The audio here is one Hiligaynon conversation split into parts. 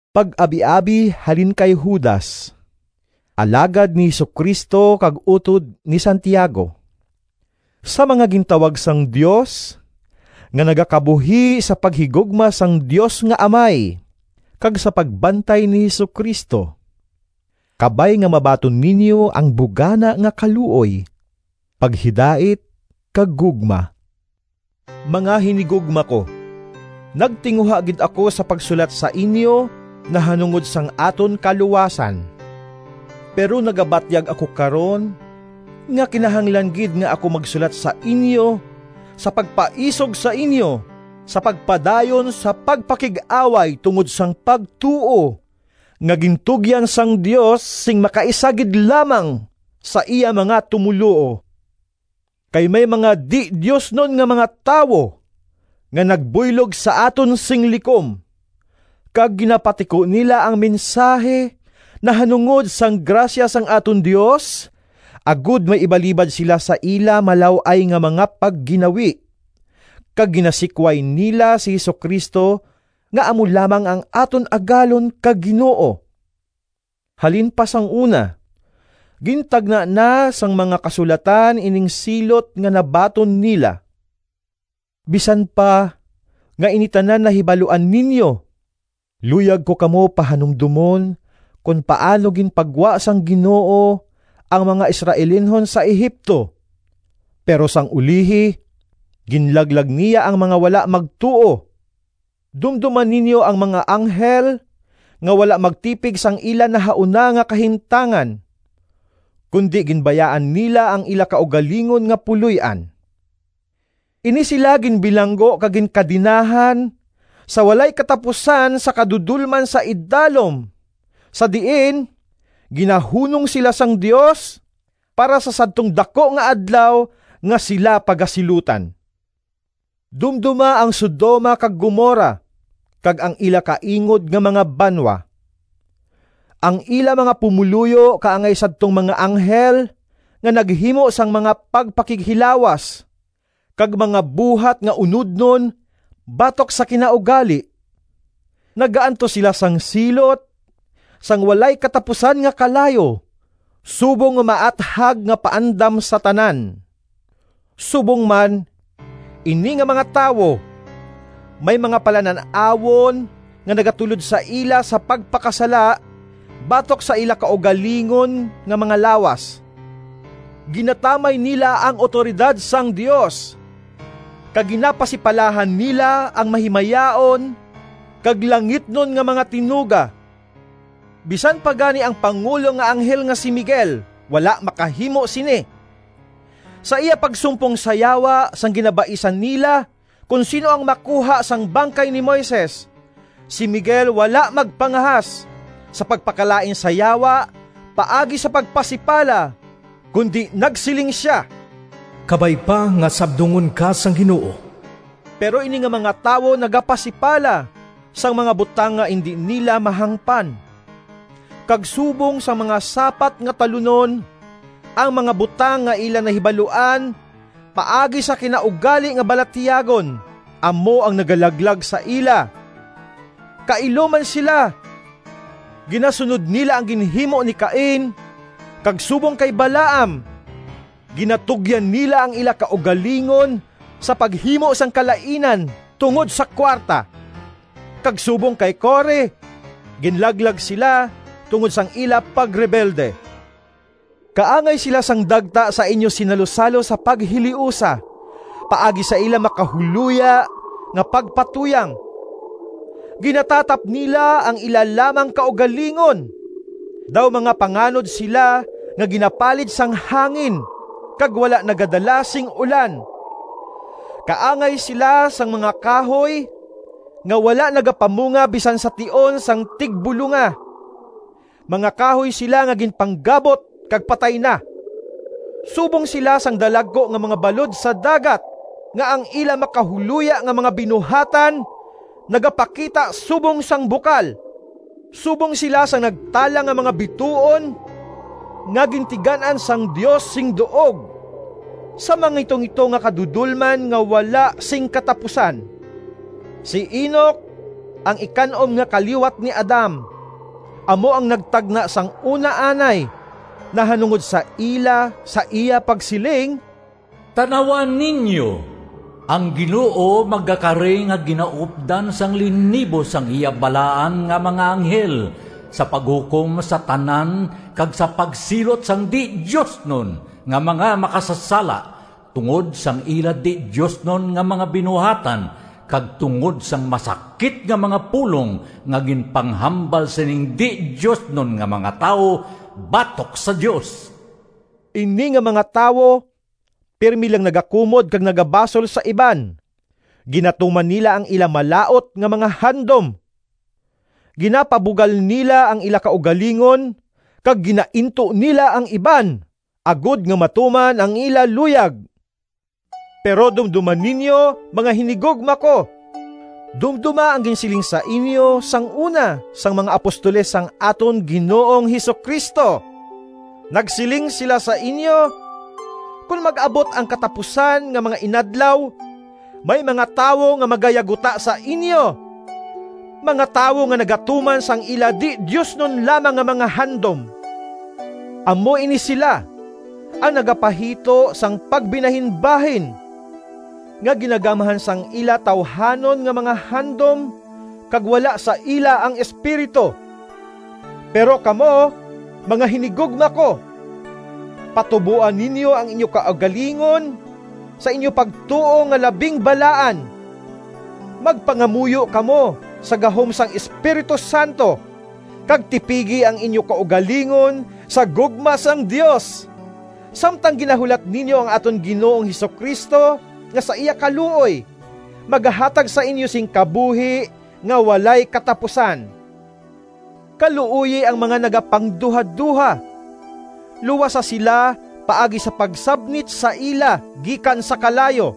Pag-abiabi halin kay Judas, alagad ni Jesu-Cristo kag utod ni Santiago— Sa mga gintawag sang Dios, nga nagakabuhi sa paghigugma sang Dios nga Amay kag sa pagbantay ni Jesu-Cristo. Kabay nga mabaton ninyo ang bugana nga kaluoy, paghidait kag gugma. Mga hinigugma ko, nagtinguha gid ako sa pagsulat sa inyo nahanungod sang aton kaluwasan. Pero nagabatyag ako karon nga kinahanglan gid nga ako magsulat sa inyo, sa pagpaisog sa inyo sa pagpadayon sa pagpakig-away tungod sang pagtuo nga gintugyan sang Dios sing makaisa gid lamang sa iya mga tumoluo. Kay may mga di-diosnon nga mga tawo nga nagbuylog sa aton sing likom, kag ginapatiko nila ang mensahi nahanungod sang grasya sang aton Dios, agod may ibalibad sila sa ila malaw-ay nga mga pagginawi, kag ginasikway nila si Jesu-Cristo nga amo lamang ang aton Agalon kag Ginoo. Halin pa sang una gintagna na sang mga Kasulatan ining silot nga nabaton nila. Bisan pa nga ini tanan nahibaluan ninyo, luyag ko kamo pahanumdomon kon paano ginpagwa sang Ginoo ang mga Israelinhon sa Egipto, pero sang ulihi ginlaglag niya ang mga wala magtuo. Dumdoma ninyo ang mga anghel nga wala magtipig sang ila nahauna nga kahimtangan, kundi ginbayaan nila ang ila kaugalingon nga puloy-an. Ini sila ginbilanggo kag ginkadenahan sa walay katapusan sa kadudolman sa idalom, sa diin ginahunong sila sang Dios para sa sadtong daku nga Adlaw nga sila pagasilutan. Dumdoma ang Sodoma kag Gomorra kag ang ila kaingod nga mga banwa. Ang ila mga pumoluyo kaangay sadtong mga anghel nga naghimo sang mga pagpakighilawas kag mga buhat nga unodnon batok sa kinaugali. Nagaantos sila sang silot sang walay katapusan nga kalayo subong nga maathag nga paandam sa tanan. Subong man, ini nga mga tawo may mga palanan-awon nga nagatulod sa ila sa pagpakasala batok sa ila kaugalingon nga mga lawas. Ginatamay nila ang awtoridad sang Dios kag ginapasipalahan nila ang mahimayaon kag langitnon nga mga tinuga. Bisan pa gani ang pangulo nga anghel nga si Miguel, wala makahimo sini. Sa iya pagsumpong sa Yawa, sang ginabaisan nila kon sin-o ang makuha sang bangkay ni Moises, si Miguel wala magpangahas sa pagpakalain sa Yawa paagi sa pagpasipala kundi nagsiling sia, “Kabay pa nga sabdungon ka sang Ginoo!” Pero ini nga mga tawo nagapasipala sang mga butang nga indi nila mahangpan. Kag subong sang mga sapat nga talunon, ang mga butang nga ila nahibaluan paagi sa kinaugali nga balatyagon, amo ang nagalaglag sa ila. Kailo man sila! Ginasunod nila ang ginhimo ni Cain, kag subong kay Balaam ginatugyan nila ang ila kaugalingon sa paghimo sang kalainan tungod sa kuwarta, kag subong kay Core ginlaglag sila tungod sang ila pagrebelde. Kaangay sila sang dagta sa inyo sinalusalo sa paghiliusa paagi sa ila makahuloya nga pagpatuyang. Ginatatap nila ang ila lamang kaugalingon. Daw mga panganod sila nga ginapalid sang hangin kag wala nagadala sing ulan. Kaangay sila sang mga kahoy nga wala nagapamunga bisan sa tion sang tigbulonga. Mga kahoy sila nga ginpanggabot kag patay na. Subong sila sang dalagku nga mga balod sa dagat, nga ang ila makahuloya nga mga binuhatan nagapakita subong sang bukal. Subong sila sang nagtalang nga mga bituon nga gintigan-an sang Dios sing duog sa mangitungito nga kadudolman nga wala sing katapusan. Si Enoc, ang ikan-om nga kaliwat ni Adam, amo ang nagtagna sang una anay nahanungod sa ila sa iya pagsiling, “Tan-awa ninyo! Ang Ginoo magakari nga ginaupdan sang linibo sang iya balaan nga mga anghel sa paghukom sa tanan kag sa pagsilot sang di-diosnon nga mga makasasala tungod sang ila di-diosnon nga mga binuhatan, kag tungod sang masakit nga mga pulong nga ginpanghambal sining di-diosnon nga mga tawo batok sa Dios!” Ini nga mga tawo pirme lang nagakumod kag nagabasol sa iban. Ginatuman nila ang ila malaut nga mga handom. Ginapabugal nila ang ila kaugalingon kag ginainto nila ang iban agod nga matuman ang ila luyag. Pero dumdoma ninyo, mga hinigugma ko! Dumdoma ang ginsiling sa inyo sang una sang mga apostoles sang aton Ginoong Jesu-Cristo. Nagsiling sila sa inyo, “Kon mag-abot ang katapusan nga mga inadlaw, may mga tawo nga magayaguta sa inyo, mga tawo nga nagatuman sang ila di-diosnon lamang nga mga handom.” Amo ini sila ang nagapahito sang pagbinahinbahin, nga ginagamhan sang ila tawuhanon nga mga handom kag wala sa ila ang Espiritu. Pero kamo, mga hinigugma ko, patuboa ninyo ang inyo kaugalingon sa inyo pagtuo nga labing balaan. Magpangamuyo kamo sa gahom sang Espiritu Santo, kag tipigi ang inyo kaugalingon sa gugma sang Dios, samtang ginahulat ninyo ang aton Ginoong Jesu-Cristo nga sa iya kaluoy, magahatag sa inyo sing kabuhi nga walay katapusan. Kaluoyi ang mga nagapangduhadoha. Luwasa sila paagi sa pagsabnit sa ila gikan sa kalayo.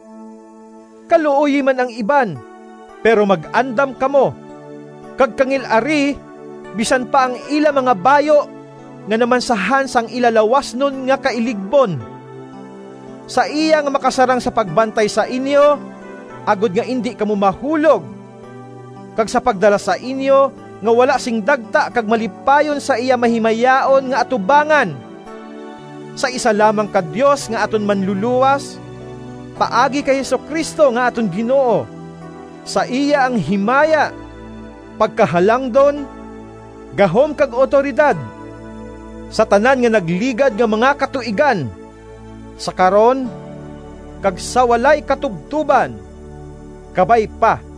Kaluoyi man ang iban, pero mag-andam kamo, kag kangil-ari bisan pa ang ila mga bayu nga namansahan sang ila lawasnon nga kailigbon. Sa iya nga makasarang sa pagbantay sa inyo agod nga indi kamo mahulog, kag sa pagdala sa inyo nga wala sing dagta kag malipayon sa iya mahimayaon nga atubangan, sa isa lamang ka Dios nga aton Manlulowas, paagi kay Jesu-Cristo nga aton Ginoo, sa iya ang himaya, pagkahalangdon, gahom kag awtoridad, sa tanan nga nagligad nga mga katuigan, sa karon, kag sa walay katubtoban! Kabay pa.